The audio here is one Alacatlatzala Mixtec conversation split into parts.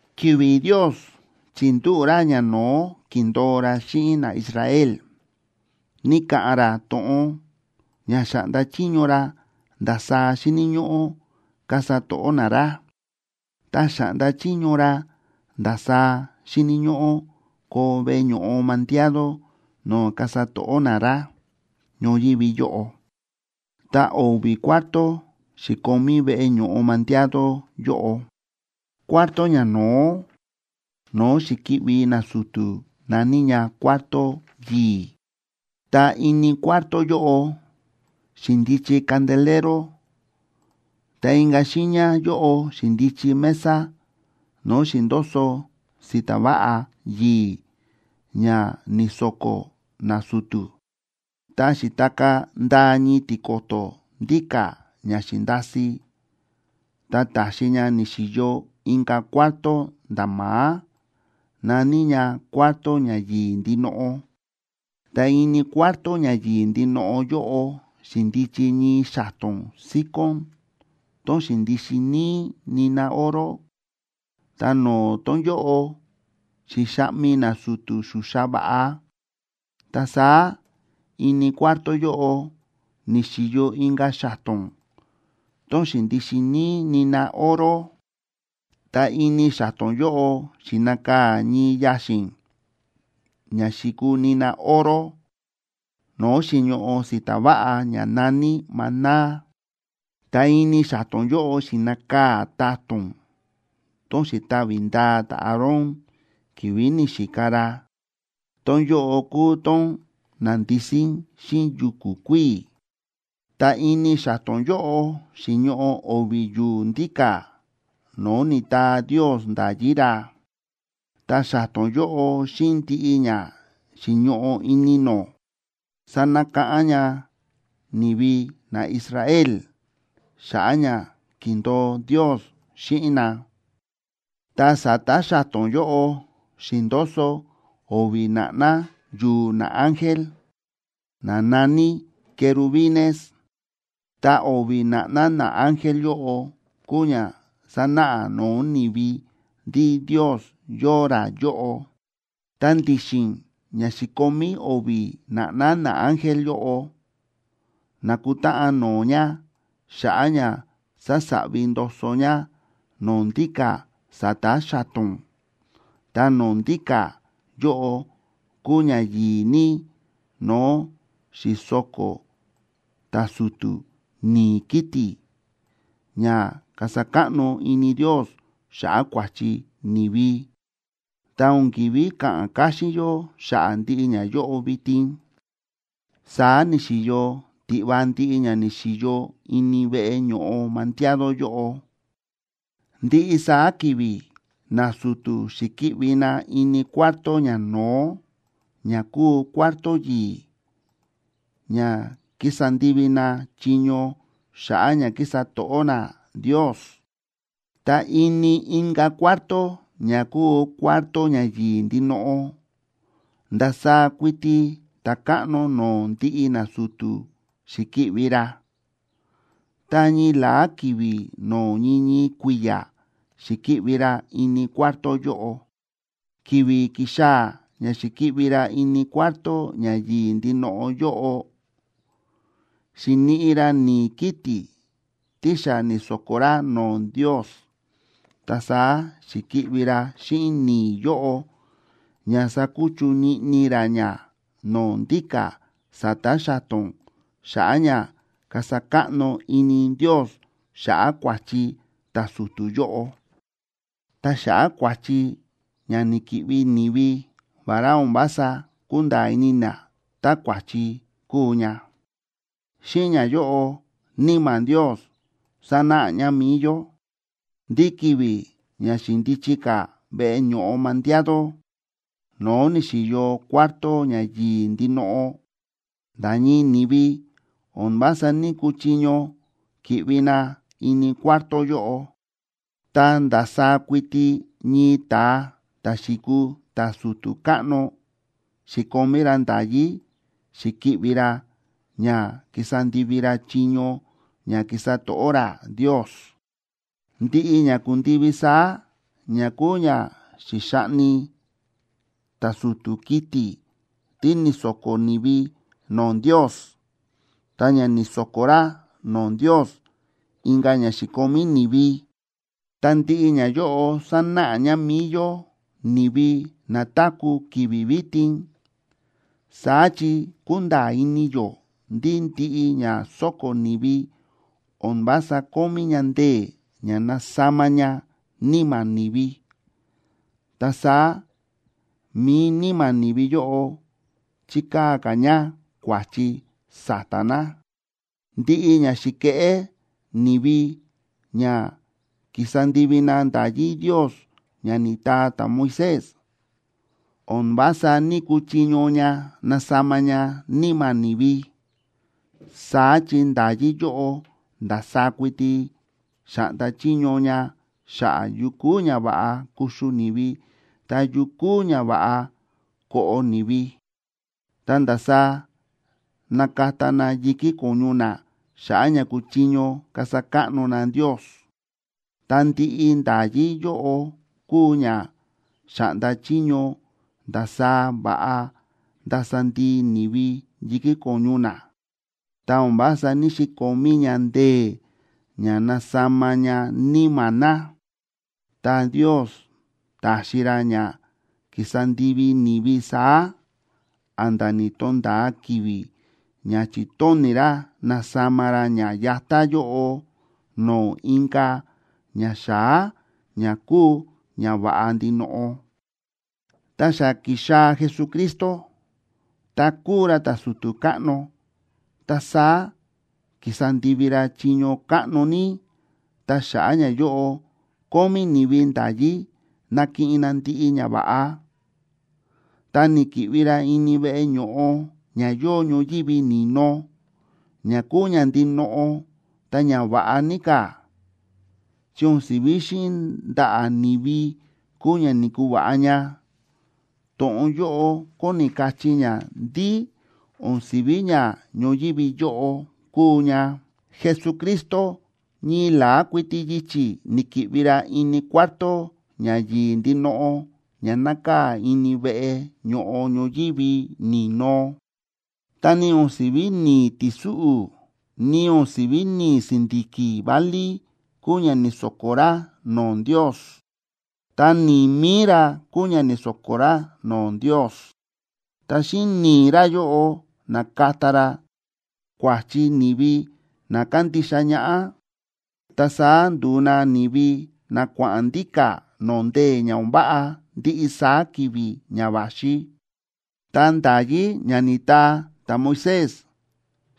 Ki̱vi̱ Ndios chi̱ndúꞌu̱ ra ñano̱ó ki̱ndo̱o ra xíꞌin naIsrael, ni̱ka̱ꞌa̱n ra to̱ꞌon ña xa̱ꞌnda chiño ra ndasaá xíni̱ ñóꞌó kasa to̱ꞌó na ra, ta xa̱ꞌnda chiño ra ndasaá xíni̱ ñóꞌó koo veꞌe ño̱ꞌo mandiado no̱o̱ kasa to̱ꞌó na ra ñoyívi yóꞌo. Ta o̱vi̱ cuarto xi̱komí veꞌe ño̱ꞌo mandiado yóꞌo. Cuarto ñano̱ó no̱o̱ xi̱ki̱ꞌvi nasu̱tu̱ na̱ní ña Cuarto Yi̱i̱, ta ini cuarto yóꞌo xi̱ndichi candelero, ta inka̱ xiiña yóꞌo xi̱ndichi mesa no̱o̱ xi̱ndoso si̱ta̱ váꞌa yi̱i̱ ña ni̱so̱ko̱ nasu̱tu̱. Ta xi̱takaa̱ ndaa ñii tiko̱to̱ ndíka̱ ña xi̱ndasi ta ta̱xi ña ni̱xi̱yo inka̱ cuarto nda̱ ma̱á, na̱ní ña Cuarto Ña Yi̱i̱ Ndinoꞌo. Ta ini Cuarto Ña Yi̱i̱ Ndinoꞌo yóꞌo, xi̱ndichi ñii xa̱to̱n síkón tón xi̱ndixin níí nina oro, ta no̱o̱ tón yóꞌo xi̱xaꞌmi nasu̱tu̱ xuxa va̱ꞌa. Ta saá ini cuarto yóꞌo ni̱xi̱yo inka̱ xa̱to̱n tón xi̱ndixin níí nina oro. Ta ini xa̱to̱n yóꞌo xi̱nakaa̱ ñii yaxi̱n ña xi̱kuu nina oro no̱o̱ xi̱ñoꞌo si̱ta̱ váꞌa ña na̱ní maná. Ta ini xa̱to̱n yóꞌo xi̱nakaa̱ ta̱to̱n tón xi̱tavi ndaa ta̱Aarón ki̱vi̱ ni̱xika ra, tón yóꞌo kúu tón na̱ndisín xíꞌin yu̱ku̱ kuíi̱. Ta ini xa̱to̱n yóꞌo xi̱ñoꞌo o̱vi̱ yu̱u̱ ndíka̱ no̱o̱ ni̱taa Ndios nda̱yí ra. Ta xa̱to̱n yóꞌo xíꞌin ndiꞌi ña xi̱ñoꞌo ini nó sa̱nakáꞌán ña ni̱vi naIsrael xa̱ꞌa̱ ña ki̱ndo̱o Ndios xíꞌin na. Ta sa̱ta̱ xa̱to̱n yóꞌo xi̱ndoso o̱vi̱ na̱ꞌná yu̱u̱ naángel, na na̱ní querubines. Ta o̱vi̱ na̱ꞌná naángel yóꞌo kúu ña sánáꞌa no̱o̱ ni̱vi ndí Ndios yóo ra yóꞌo. Ta ndi̱xi̱n ña xi̱komí o̱vi̱ na̱ꞌná naángel yóꞌo na̱kutáꞌan no̱o̱ ña xa̱ꞌa̱ ña sásaꞌvi ndoso ña no̱o̱ ndíka̱ sa̱ta̱ xa̱to̱n, ta no̱o̱ ndíka̱ yóꞌo kúu ña yi̱i̱ ní no̱o̱ xi̱so̱ko̱ ta̱su̱tu̱ ni̱i̱ kiti̱ ña kasa káꞌno ini Ndios xa̱ꞌa̱ kua̱chi ni̱vi. Ta o̱n ki̱ví ka̱ꞌa̱n káxín yó xa̱ꞌa̱ ndiꞌi ñayóꞌo vitin. Saá ni̱xi̱yo tiꞌva ndiꞌi ña ni̱xi̱yo ini veꞌe ño̱ꞌo mandiado yóꞌo. Ndiꞌi saá ki̱vi̱ nasu̱tu̱ xi̱ki̱ꞌvi na ini cuarto ñano̱ó ña kúu Cuarto Yi̱i̱ ña kísa ndivi na chiño xa̱ꞌa̱ ña kísa to̱ꞌó na Ndios. Ta ini inka̱ cuarto ña kúu Cuarto Ña Yi̱i̱ Ndinoꞌo, ndasaá kuiti ta̱káꞌno no̱o̱ ndiꞌi nasu̱tu̱ xi̱ki̱ꞌvi ra, ta ñii la̱á ki̱vi̱ no̱o̱ ñii ñii kui̱ya̱ xi̱ki̱ꞌvi ra ini cuarto yóꞌo. Ki̱vi̱ ki̱xaa̱ ña xi̱ki̱ꞌvi ra ini Cuarto Ña Yi̱i̱ Ndinoꞌo yóꞌo, xi̱niꞌi ra ni̱i̱ kiti̱ tí xa ni̱so̱ko̱ ra no̱o̱ Ndios. Ta saá xi̱ki̱ꞌvi ra xíꞌin ni̱i̱ yóꞌo ña sakuchu niꞌni ra ña no̱o̱ ndíka̱ sa̱ta̱ xa̱to̱n, xa̱ꞌa̱ ña kasa káꞌno ini Ndios xa̱ꞌa̱ kua̱chi ta̱su̱tu̱ yóꞌo, ta xa̱ꞌa̱ kua̱chi ña ni̱ki̱ꞌvi ni̱vi, vará o̱n vása kúnda̱a̱ ini na tá kua̱chi kúu ña. Xíꞌin ñayóꞌo Níma̱ Ndios sánáꞌa ña mi̱i yó, ndí ki̱vi̱ ña xi̱ndichi ka̱ veꞌe ño̱ꞌo mandiado, no̱o̱ ni̱xi̱yo Cuarto Ña Yi̱i̱ Ndinoꞌo, nda̱ ñii ni̱vi o̱n vása ní‑kuchiño ki̱ꞌvi na ini cuarto yóꞌo, ta ndasaá kuiti ñii ta̱a ta̱ xi̱kuu ta̱su̱tu̱ káꞌno xi̱komí ra nda̱yí xi̱ki̱ꞌvi ra ña kísa ndivi ra chiño ña kísa to̱ꞌó ra Ndios. Ndiꞌi ña ku̱ndivi saá, ña kúu ña xi̱xaꞌni ta̱su̱tu̱ kiti̱ tí ni̱so̱ko̱ ni̱vi no̱o̱ Ndios ta ña ni̱so̱ko̱ ra no̱o̱ Ndios inka̱ ña xi̱komí ni̱vi, ta ndiꞌi ñayóꞌo sánáꞌa ña mi̱i yó ni̱vi na táku̱ ki̱vi̱ vitin. Saá chi kúnda̱a̱ ini yó ndí ndiꞌi ña sóko̱ ni̱vi o̱n vása kómí ña ndee̱ ña nasama ña níma̱ ni̱vi, ta saá mi̱i níma̱ ni̱vi yóꞌo chíkaa̱ ka̱ ña kua̱chi sa̱ta̱ na. Ndiꞌi ña xi̱keꞌé ni̱vi ña ki̱sa ndivi na nda̱yí Ndios ña ni̱taa ta̱Moisés, o̱n vása ní‑kuchiño ña nasama ña níma̱ ni̱vi. Saá chi nda̱yí yóꞌo ndasaá kuiti xa̱ꞌnda chiño ña xa̱ꞌa̱ yu kúu ña va̱ꞌa kuxu ni̱vi, ta yu kúu ña va̱ꞌa koꞌo ni̱vi, ta ndasaá nakata na yi̱kí ko̱ñu na xa̱ꞌa̱ ña kuchiño kasa káꞌno na Ndios. Ta ndiꞌi nda̱yí yóꞌo kúu ña xa̱ꞌnda chiño ndasaá va̱ꞌa ndasa ndii ni̱vi yi̱kí ko̱ñu na, ta o̱n vása ní‑xikomí ña ndee̱ ña nasama ña níma̱ na. Ta Ndios ta̱xi ra ña ki̱sa ndivi ni̱vi saá, a̱nda̱ ni̱to̱nda̱a ki̱vi̱ ña chi̱tóni̱ ra nasama ra ña yatá yóꞌo no̱o̱ inka̱ ña xa̱á ña kúu ña va̱ꞌa ndinoꞌo. Ta xa ki̱xaa̱ Jesucristo, ta kúu ra ta̱su̱tu̱ káꞌno, ta saá ki̱sa ndivi ra chiño káꞌno ní, ta xa̱ꞌa̱ ñayóꞌo kómí ni̱vi nda̱yí nakiꞌin na ndiꞌi ñava̱ꞌa. Ta ni̱ki̱ꞌvi ra ini veꞌe ño̱ꞌo ña yóo ñoyívi ni̱no, ña kúu ña ndinoꞌo ta ña va̱ꞌa ní ka̱. Chi o̱n si̱ví xíꞌin ndaꞌa̱ ni̱vi kúu ña ni̱kuva̱ꞌa ña; to̱ꞌon yóꞌo kóni kachí ña ndí o̱n si̱ví ña ñoyívi yóꞌo kúu ña. Jesucristo ñii la̱á kuiti yichi̱ ni̱ki̱ꞌvi ra ini Cuarto Ña Yi̱i̱ Ndinoꞌo ña nákaa̱ ini veꞌe ño̱ꞌo ñoyívi ni̱no, ta ni o̱n si̱ví ni̱i̱ ti̱súꞌu̱, ni o̱n si̱ví ni̱i̱ si̱ndi̱ki̱ válí kúu ña ni̱so̱ko̱ ra no̱o̱ Ndios. Ta ni̱i̱ mi̱i ra kúu ña ni̱so̱ko̱ ra no̱o̱ Ndios. Ta xíꞌin ni̱i̱ ra yóꞌo na̱kata ra kua̱chi ni̱vi na kándixa ñaꞌá, ta saá ndu̱u na ni̱vi na kua̱ꞌa̱n ndíka̱ no̱o̱ ndee̱ ña o̱n váꞌa ndiꞌi saá ki̱vi̱ ña va̱xi. Ta nda̱yí ña ni̱taa ta̱Moisés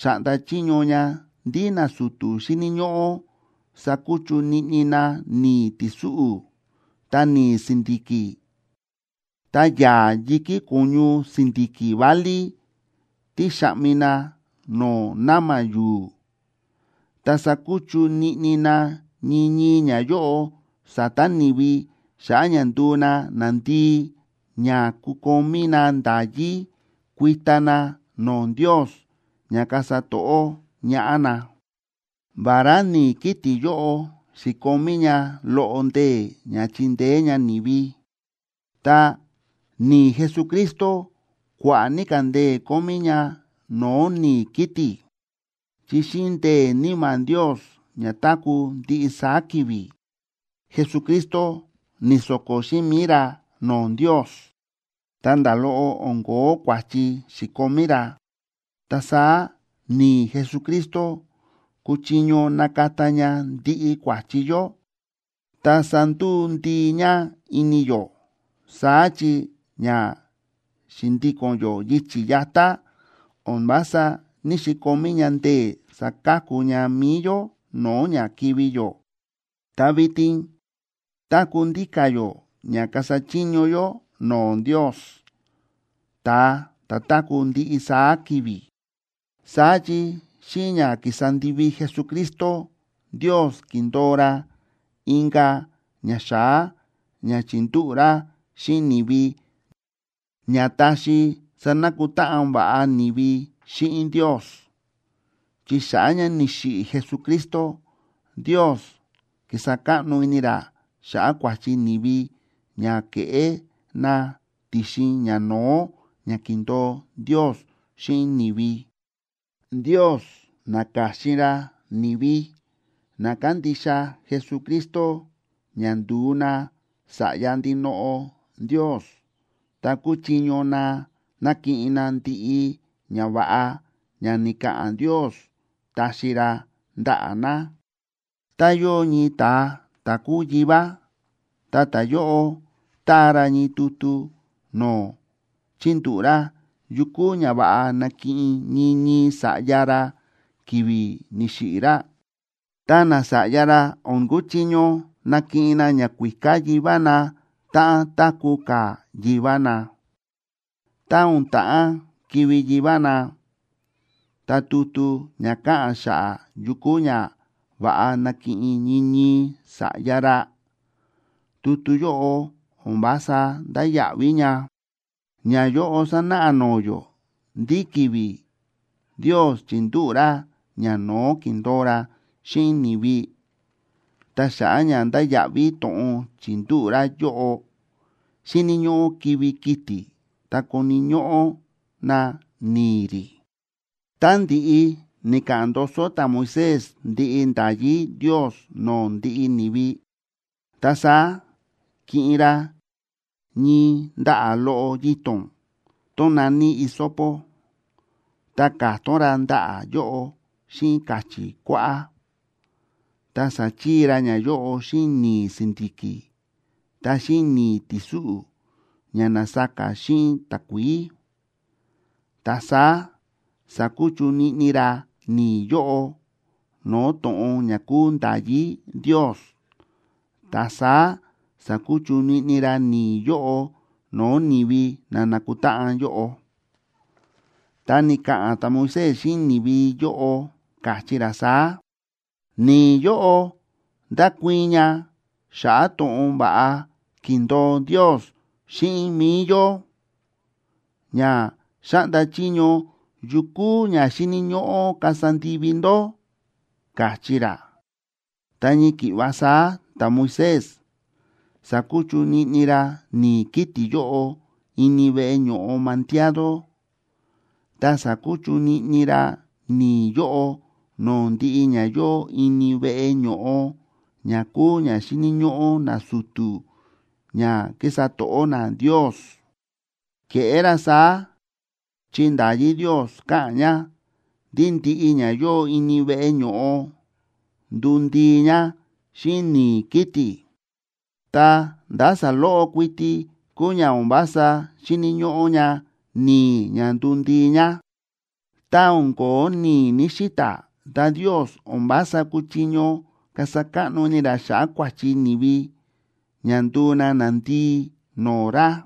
xa̱ꞌnda chiño ña ndí nasu̱tu̱ xíni̱ ñóꞌó sakuchu niꞌni na ni̱i̱ ti̱súꞌu̱, ta ni̱i̱ si̱ndi̱ki̱, ta yaa̱ yi̱kí ko̱ñu si̱ndi̱ki̱ válí tí xa̱ꞌmi na no̱o̱ na̱ma̱ yu̱u̱, ta sakuchu niꞌni na ñii ñii ñayóꞌo sa̱ta̱ ni̱vi xa̱ꞌa̱ ña nduu na nandii, ña kukomí na nda̱yí kuita na no̱o̱ Ndios ña kasa to̱ꞌó ñaꞌá na. Vará ni̱i̱ kiti̱ yóꞌo xi̱komí ña loꞌo ndee̱ ña chindeé ña ni̱vi, ta, ¡ni̱i̱ Jesucristo kua̱ꞌa̱ ní ka̱ ndee̱ kómí ña no̱o̱ ni̱i̱ kiti̱! Chi xíꞌin ndee̱ Níma̱ Ndios ña táku̱ ndiꞌi saá ki̱vi̱, Jesucristo ni̱so̱ko̱ xíꞌin mi̱i ra no̱o̱ Ndios, ta nda̱ loꞌo o̱n ko̱ó kua̱chi xi̱komí ra. Ta saá ni̱i̱ Jesucristo kúchiño nakata ña ndiꞌi kua̱chi yó ta sanduu ndii ña ini yó. Saá chi ña xi̱ndíko̱n yó yichi̱ yatá o̱n vása ní‑xikomí ña ndee̱ saka̱ku ña mi̱i yó no̱o̱ ña kivi̱ yó. Ta vitin táku̱ ndíka̱ yó ña kasa chiño yó no̱o̱ Ndios, ta̱a ta̱ táku̱ ndiꞌi saá ki̱vi̱. Saá chi xíꞌin ña ki̱sa ndivi Jesucristo, Ndios ki̱ndo̱o ra inka̱ ña xa̱á ña chi̱ndúꞌu̱ ra xíꞌin ni̱vi ña taxi sanakutáꞌan va̱ꞌa ni̱vi xíꞌin Ndios. Chi xa̱ꞌa̱ ña ni̱xiꞌi̱ Jesucristo, Ndios ki̱sa káꞌno ini ra xa̱ꞌa̱ kua̱chi ni̱vi ña ke̱ꞌé na ti̱xin ñano̱ó ña ki̱ndo̱o Ndios xíꞌin ni̱vi. Ndios na̱ka̱xin ra ni̱vi na kándixa Jesucristo ña ndu̱u na sa̱ꞌya ndinoꞌo Ndios, ta kúchiño na nakiꞌin na ndiꞌi ñava̱ꞌa ña ni̱ka̱ꞌa̱n Ndios taxi ra ndaꞌa̱ na. Tá yóo ñii ta̱a ta̱ kúu yivá, ta ta̱yóꞌo táa ra ñii tutu no̱o̱ chíndúꞌu̱ ra yukú ñava̱ꞌa nakiꞌin ñii ñii sa̱ꞌya ra ki̱vi̱ ni̱xiꞌi̱ ra, ta nasa̱ꞌya ra o̱n kuchiño nakiꞌin na ñakuíká yivá na táꞌan táku̱ ka̱ yivá na. Tá o̱n ta̱ꞌán kivi̱ yivá na, ta tutu ña káꞌa̱n xa̱ꞌa̱ yukú ñava̱ꞌa nakiꞌin ñii ñii sa̱ꞌya ra, tutu yóꞌo o̱n vása ndáya̱ꞌví ña. Ñayóꞌo sánáꞌa no̱o̱ yó ndí ki̱vi̱ Ndios chi̱ndúꞌu̱ ra ñano̱ó ki̱ndo̱o ra xíꞌin ni̱vi, ta xa̱ꞌa̱ ña ndáya̱ꞌví to̱ꞌon chi̱ndúꞌu̱ ra yóꞌo, xíni̱ ñóꞌó kivi̱ kiti̱ ta koni̱ ñóꞌó na ni̱i̱ rí. Tá ndi̱ꞌi ni̱ka̱ꞌa̱n ndoso ta̱Moisés ndiꞌi nda̱yí Ndios no̱o̱ ndiꞌi ni̱vi, ta saá ki̱ꞌin ra ñii ndaꞌa̱ loꞌo yito̱n tón na̱ní hisopo, ta ka̱tón ra ndaꞌa̱ yóꞌo xíꞌin ka̱chi̱ kuáꞌá, ta sa̱chii ra ñayóꞌo xíꞌin ni̱i̱ si̱ndi̱ki̱ ta xíꞌin ni̱i̱ ti̱súꞌu̱, ña na̱saka xíꞌin takuií. Ta saá sa̱kuchu niꞌni ra ni̱i̱ yóꞌo no̱o̱ to̱ꞌon ña kúu nda̱yí Ndios, ta saá sa̱kuchu niꞌni ra ni̱i̱ yóꞌo no̱o̱ ni̱vi na na̱kutáꞌan yóꞌo. Ta ni̱ka̱ꞌa̱n ta̱Moisés xíꞌin ni̱vi yóꞌo, káchí ra saá: “Ni̱i̱ yóꞌo ndákuii̱n ña xa̱ꞌa̱ to̱ꞌon va̱ꞌa ki̱ndo̱o Ndios xíꞌin mi̱i yó, ña xáꞌnda chiño yu kúu ña xíni̱ ñóꞌó kasa ndivi ndó”, káchí ra. Ta ñii ki̱ꞌva saá ta̱Moisés sa̱kuchu niꞌni ra ni̱i̱ kiti̱ yóꞌo ini veꞌe ño̱ꞌo mandiado, ta sa̱kuchu niꞌni ra ni̱i̱ yóꞌo no̱o̱ ndiꞌi ña yóo ini veꞌe ño̱ꞌo ña kúu ña xíni̱ ñóꞌó nasu̱tu̱ ña kísa to̱ꞌó na Ndios. Ke̱ꞌé ra saá, chi nda̱yí Ndios káꞌa̱n ña ndí ndiꞌi ña yóo ini veꞌe ño̱ꞌo nduu ndii ña xíꞌin ni̱i̱ kiti̱, ta ndá saloꞌo kuiti kúu ña o̱n vása xíni̱ ñóꞌó ña ni̱i̱ ña nduu ndii ña. Tá o̱n ko̱ó ni̱i̱ ní‑xita̱, ta Ndios o̱n vása kúchiño kasa káꞌno ini ra xa̱ꞌa̱ kua̱chi ni̱vi ña nduu na nandii no̱o̱ ra.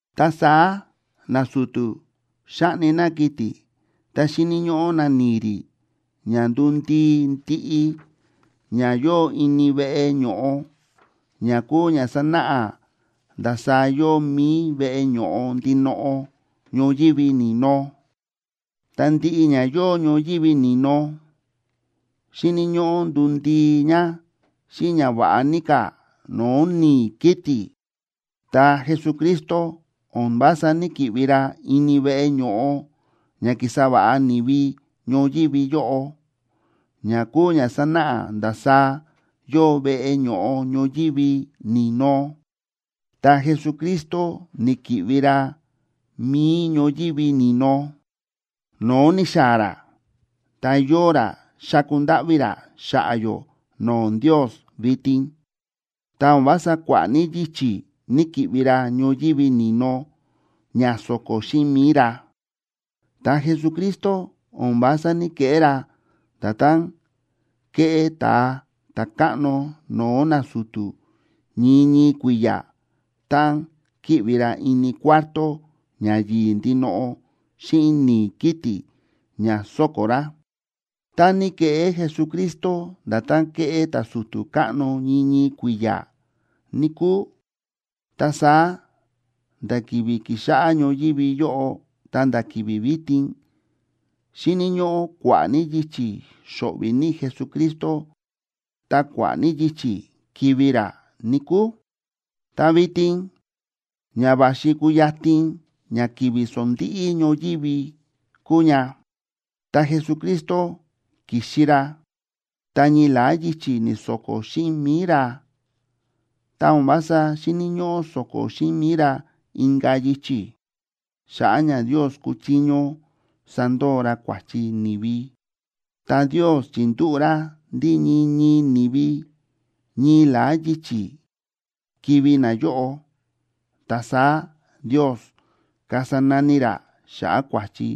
Ta saá nasu̱tu̱ xáꞌni na kiti̱ ta xíni̱ ñóꞌó na ni̱i̱ rí ña nduu ndii ndiꞌi ña yóo ini veꞌe ño̱ꞌo, ña kúu ña sánáꞌa ndasaá yóo mi̱i veꞌe ño̱ꞌo ndinoꞌo ñoyívi ni̱no. Ta ndiꞌi ña yóo ñoyívi ni̱no xíni̱ ñóꞌó nduu ndii ña xíꞌin ña va̱ꞌa ní ka̱ no̱o̱ ni̱i̱ kiti̱. Ta Jesucristo o̱n vása ní‑kiꞌvi ra ini veꞌe ño̱ꞌo ña ki̱sa va̱ꞌa ni̱vi ñoyívi yóꞌo, ña kúu ña sánáꞌa ndasaá yóo veꞌe ño̱ꞌo ñoyívi ni̱no. Ta Jesucristo ni̱ki̱ꞌvi ra mi̱i ñoyívi ni̱no, no̱o̱ ni̱xaa̱ ra ta yóo ra xáku ndáꞌví ra xa̱ꞌa̱ yó no̱o̱ Ndios vitin. Ta o̱n vása kua̱ꞌa̱ ní yichi̱ ni̱‑kiꞌvi ra ñoyívi ni̱no ña so̱ko̱ xíꞌin mi̱i ra. Ta Jesucristo o̱n vása ní‑keꞌé ra nda̱tán kéꞌé ta̱a ta̱káꞌno no̱o̱ nasu̱tu̱ ñii ñii kui̱ya̱ táꞌan kíꞌvi ra ini Cuarto Ña Yi̱i̱ Ndinoꞌo xíꞌin ni̱i̱ kiti̱ ña so̱ko̱ ra. Tá ní ke̱ꞌé Jesucristo nda̱tán kéꞌé ta̱su̱tu̱ káꞌno ñii ñii kui̱ya̱, níkúu, ta saá nda̱ ki̱vi̱ ki̱xáꞌá ñoyívi yóꞌo ta̱nda̱ ki̱vi̱ vitin, xíni̱ ñóꞌó kua̱ꞌa̱ ní yichi̱ xo̱ꞌvi̱ ní Jesucristo ta kua̱ꞌa̱ ní yichi̱ kivi̱ ra, níkúu. Ta vitin ña va̱xi kuyatin ña ki̱vi̱ sondíꞌí ñoyívi kúu ña, ta Jesucristo ki̱xi ra ta ñii la̱á yichi̱ ni̱so̱ko̱ xíꞌin mi̱i ra, ta o̱n vása xíni̱ ñóꞌó so̱ko̱ xíꞌin mi̱i ra inka̱ yichi̱, xa̱ꞌa̱ ña Ndios kuchiño sandoo ra kua̱chi ni̱vi. Ta Ndios chi̱ndúꞌu̱ ra ndí ñii ñii ni̱vi, ñii la̱á yichi̱ kivi̱ nayóꞌo, ta saá Ndios kasa nani ra xa̱ꞌa̱ kua̱chi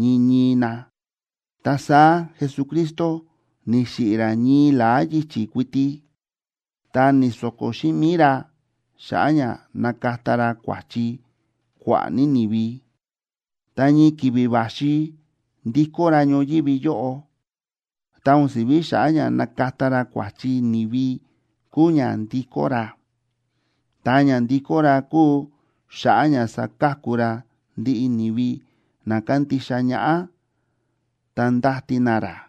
ñii ñii na. Ta saá Jesucristo ni̱xiꞌi̱ ra ñii la̱á yichi̱ kuiti, ta ni̱so̱ko̱ xíꞌin mi̱i ra xa̱ꞌa̱ ña nakata ra kua̱chi kua̱ꞌa̱ ní ni̱vi. Tá ñii ki̱vi̱ va̱xi ndikó ra ñoyívi yóꞌo, ta o̱n si̱ví xa̱ꞌa̱ ña nakata ra kua̱chi ni̱vi kuu ña ndikó ra, ta ña ndikó ra kuu xa̱ꞌa̱ ña saka̱ku ra ndiꞌi ni̱vi na kándixa ñaꞌá ta ndáti na ra.